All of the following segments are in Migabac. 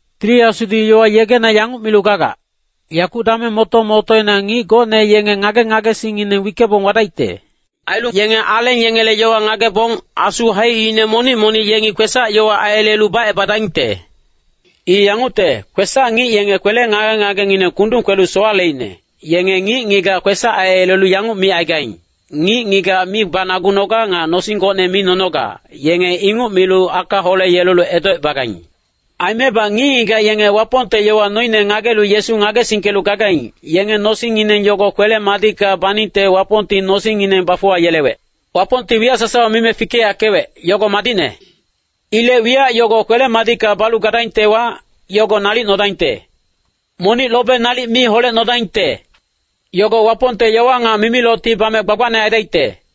Tili Asudi yowa yegena yanguc milu gagac, yakuc dameng moto-motoina ngic gocne yenge ngage-ngagesingngineng wickebong wadaicte. Ailu yenge aleng yengele yowa ngagebong, asu haicine monic-monic yengi kwesac-yowa aiyelelu bacebadaingte. I yangucte, kwesac-ngic yenge kwele ngage-ngagengineng kundung kwelu sowaleicne, yenge ngic-ngigac kwesac aiyelelu yanguc micaigaing, “Ngic-ngigac mi banagunoga.” Nga “Nosing gocne mi nonoga.” Yenge inguc milu aka holeyelelu edocebagaing. Aimebac ngic-ngigac yenge Wapongte yowa noine ngagelu Yesu ngagesingkelu gagaing, yenge nosingngineng yogo kwele-madicka baningte Wapongti nosingngineng bafuwayelewec. Wapongti wiyac sasawa mime fikeyackewec, yogo madicne. Ilec wiyac yogo kwele-madicka balu gadaingtewa, yogo nalic nodaingte. Monic lobe nalic mi holecnodaingte. Yogo Wapongte yowa nga mimilocti bame gbagbacne aidaicte.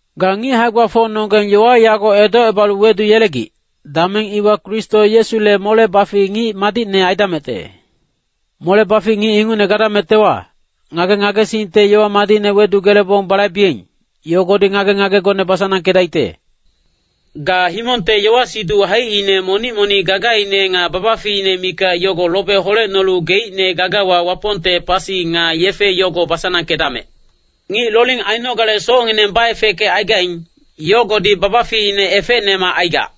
Ga ngic hae-gbafocnonggeng yowa yago edocebalu weduyelegic, dameng iwa Kristo Yesule mole-bafic ngic madicne aidamecte. Mole-bafic ngic ingucne gadamectewa, ngage-ngagesingte yowa madicne wedugelebong balaibeing, yogodi ngage-ngagegone basanangkedaicte. Ga himongte yowa-siduc haicine monic-monic gagaine nga babaficine mikac yogo lobe holecnolu geicne gagawa Wapongte pasi nga yefe yogo basanangkedamec. Ngic loling ainogale socngineng baefeckecaigaing, yogodi babaficine efecnemac aigac.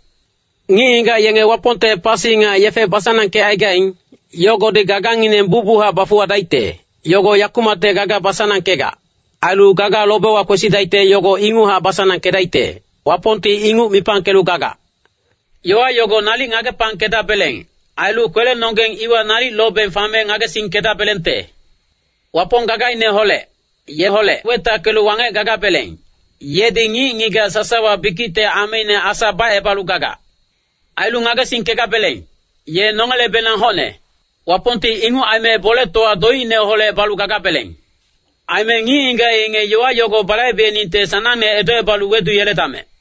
Ngic-ngigac yenge Wapongte pasi nga yefe basanangkecaigaing, yogodi gagangineng bucbuchac bafuwadaicte. Yogo yakumacte gaga basanangkegac, ailu gaga lobewa kwesidaicte yogo inguchac basanangkedaicte. Wapongti inguc mipangkelu gagac. Yowa yogo nalic ngagepangkedabeleng. Ailu kwelenonggeng iwa nalic lobeng fame ngagesingkedabelengte. Wapong gagaineholec, yeholec wetackelu wangec gagabeleng, yedi ngic-ngigac sasawa bikicte ameine Asa bacebalu gagac. Ailu ngagesingkegabeleng, ye nongelebenang hocne. Wapongti inguc aime boletowa doicineholec balu gagabeleng. Aime ngic-ngigac yenge yowa yogo balaibeningte sanangne edocebalu weduyeledamec.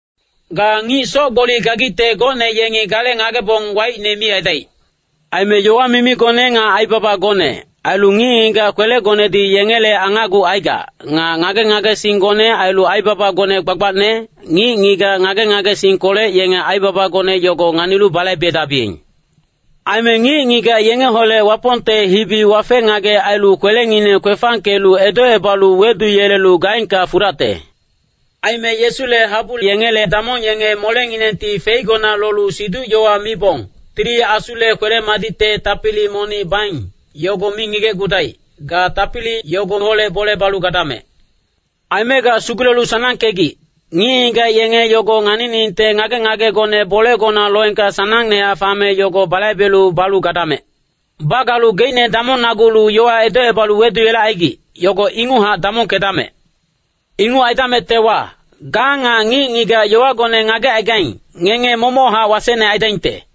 Ga ngic soc-gboli gagicte gocne yengi gale ngagebong waicne mi aidaic. Aime yowa mimigone nga aibabagone, ailu ngic-ngigac kwelegonedi yengele angacgucaigac, nga ngage-ngagesinggone ailu aibabagone gbagbacne, ngic-ngigac ngage-ngagesingkolec yenge aibabagone yogo nganilu balaibedabiyeng. Aime ngic-ngigac yengeholec Wapongte hibi wafe-ngagec ailu kwelengineng kwefangkelu edocebalu weduyelelu gaengka fudacte. Aime Yesule habu yengele damong yenge molenginengti feigona lolu siduc-yowa mibong, Tili Asule kwele-madicte tapili monic baing, yogo mi ngigecgudaic. Ga tapili yogoholec bole balu gadamec. Aime ga sugulelu sanangkegic, ngic-ngigac yenge yogo nganiningte ngage-ngagegone bolegona loengka sanangnehac fame yogo balaibelu balu gadamec. Bagalu geicne damongnagulu yowa edocebalu weduyelecaigic, yogo inguchac damongkedamec. Inguc aidamectewa, ga nga ngic-ngigac yowagone ngagecaigaing, ngenge momochac wasecne aidaingte.